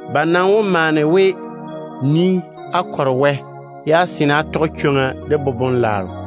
Ba maa wó lɔre á na kɔre Wɛ, ye á seene á tɔge chwoŋa de boboŋ-dɛɛra.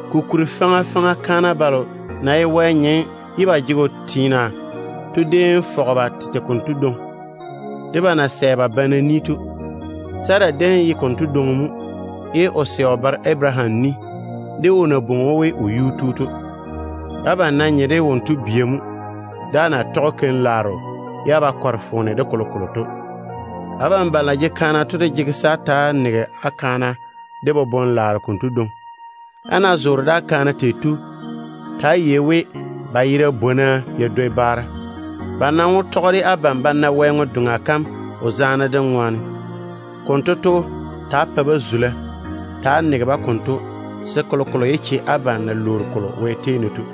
Kokuri, faŋa faŋa kaana balo na ye Wɛ nyem ye ba ke ba teena ded‑o to déem fɔge ba tete konto dwoŋi, de ba na sɛ ba pa ba banna to. Sara déem ye konto dwoŋi mo, ye o sɛ o baro Abaraham ni, de o na bwoŋi‑o we o yuu tu to. Abam de nam ye wonto bia mo, ne á ná ke keim-laaro ye á wo pɛ foone zo abam de kolokolo. Abam balo de na ye kan-banna to maŋe se á ta‑á nege á kaana de boboŋ-laaro konto dwoŋi mo. Á na zoore de á kaana bam tei to, ta‑á yei-na we ba yera bwona ya dwoi baara. Ba nam wó tɔge de abam ba na Wɛ ŋwe-doŋa kam o zaane dem ŋwaane. Konto to, á ta‑á pa-ba zula, se kolokolo yé che abam na lwoori kolo Wɛ tei ne to.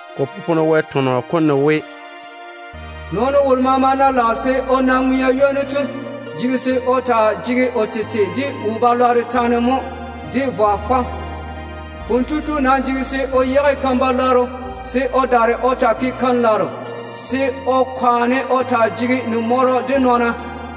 Ko popone Wɛ tɔnɔ kom ne we: “Nɔɔno wolo maama ná lage se o na ŋwea ywoni, kotu jege se o ja o tete mo de ta-balwaaro ŋɔŋa de vwa fɔm. O nam jege se o yage totoŋ-lwanno keim, se o daare o taa tɔge keim-laaro, ye o kwaane o taa zoore de wo-zuru de ni-ywom.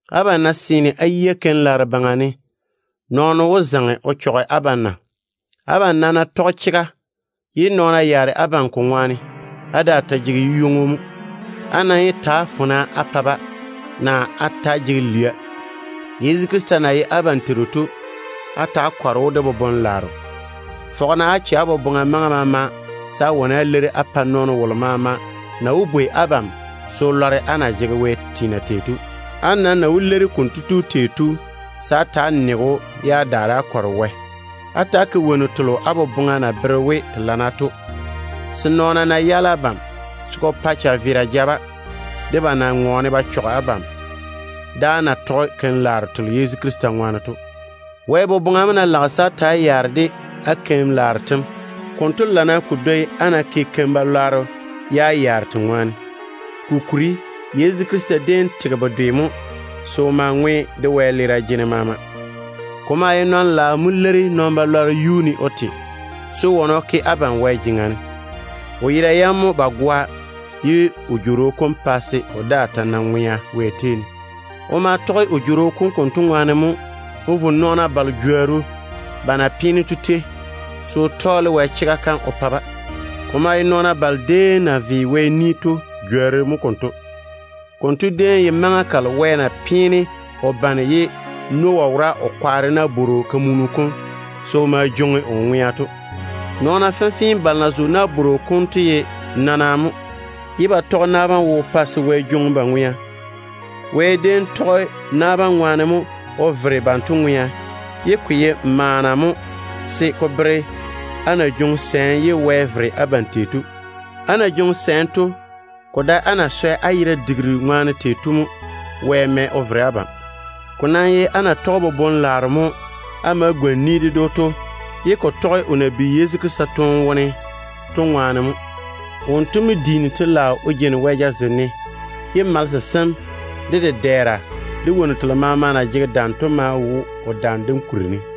Abam ná seene á yia keim-laaro baŋa ne, wɔ mo wó wane o ke wo-lɔŋɔ o yage á yuu ne? Abam nam ná tɔge chega, ye nɔɔna yaare abam ko ŋwaane, á daa ta jege yu-ywoŋo mo. Á nam yé ta‑á fona de-ba, naa á ta‑á jege lwia. Yezu Krista na ye abam Teiru to, á ta‑á kɔre‑o de boboŋ-laaro. Fɔge-na á che á boboŋa maŋa maama se á wane á leiri nɔɔno wolo maama na wó bwei abam se o lɔre á na ke tei á daŋe á teena Wɛ baŋa ne to. Ko nam maŋe se á leiri‑o de bochare-zuru de zula. Ta‑á ke-na wonnu telo á boboŋa na bere we te lana to, se nɔɔna ná yaale abam, se ko pa chaveera ja-ba, de ba na ŋɔɔne ba chɔge keim-laaro telo á na yeini á ke Yezu Krista ŋwaane to. Wɛ boboŋa mo ná lage se á ta‑á nae yaara á keim-laaro tem baŋa ne, konto lana ko dwoi á ná ke keim-balwaaro ye á yaare te ŋwaane. Kokuri, Yezu Krista déem tege bedwe mo se o ma ŋwe nabiina wɛleera jene maama. Ko maa ye nɔn-ŋom mo leiri nɔn-balwaaro yuu ne o te, se o wane o ke abam Wɛ jeŋa ne. O yera yam mo ba goa, ye o jworo kom pa se o daa ta na ŋwea Wɛ tei ne. O ma tɔge o jworo kom konto ŋwaane mo o vo nɔɔna balo jworru ba na pe churu ne to tei, se o tɔɔle Wɛ chega kam o bere-ba. Ko maa ye nɔɔna balo déem na ve Wɛ ni to jworru mo konto. Konto déem ye maŋa kalo Wɛ na peene o bane ye Noah wora o kwaare nabwor-kamunu kom se o ma jwoŋi o ŋwea to. Nɔɔna fenfee balo na zo nabworo kom wo to ye nana mo, ye ba tɔge na bam wo pa se Wɛ jwoŋi ba ŋwea. Wɛ déem tɔge na bam ŋwaane mo o vere banto ŋwea, ye ko ye maana mo se ko bere á na jwoŋi sɛɛm ye Wɛ vere abam tei to. Á na jwoŋi sɛɛm to, ko dae á na swɛ á yera digiru ŋwaane tei to mo Wɛ mɛ o vere abam. Ko nam ye á na tɔge boboŋ-laaro mo á ma gwoni ni ded‑o to, ye ko tɔge o na bi Yezu Krista toone wone to ŋwaane mo. Wonto mo diini wɛyuu o jeini Wɛ jazem ne, ye malese sem, de dedɛɛra, de wonnu telo maama na jege dam to maa wo o dam kuri ne.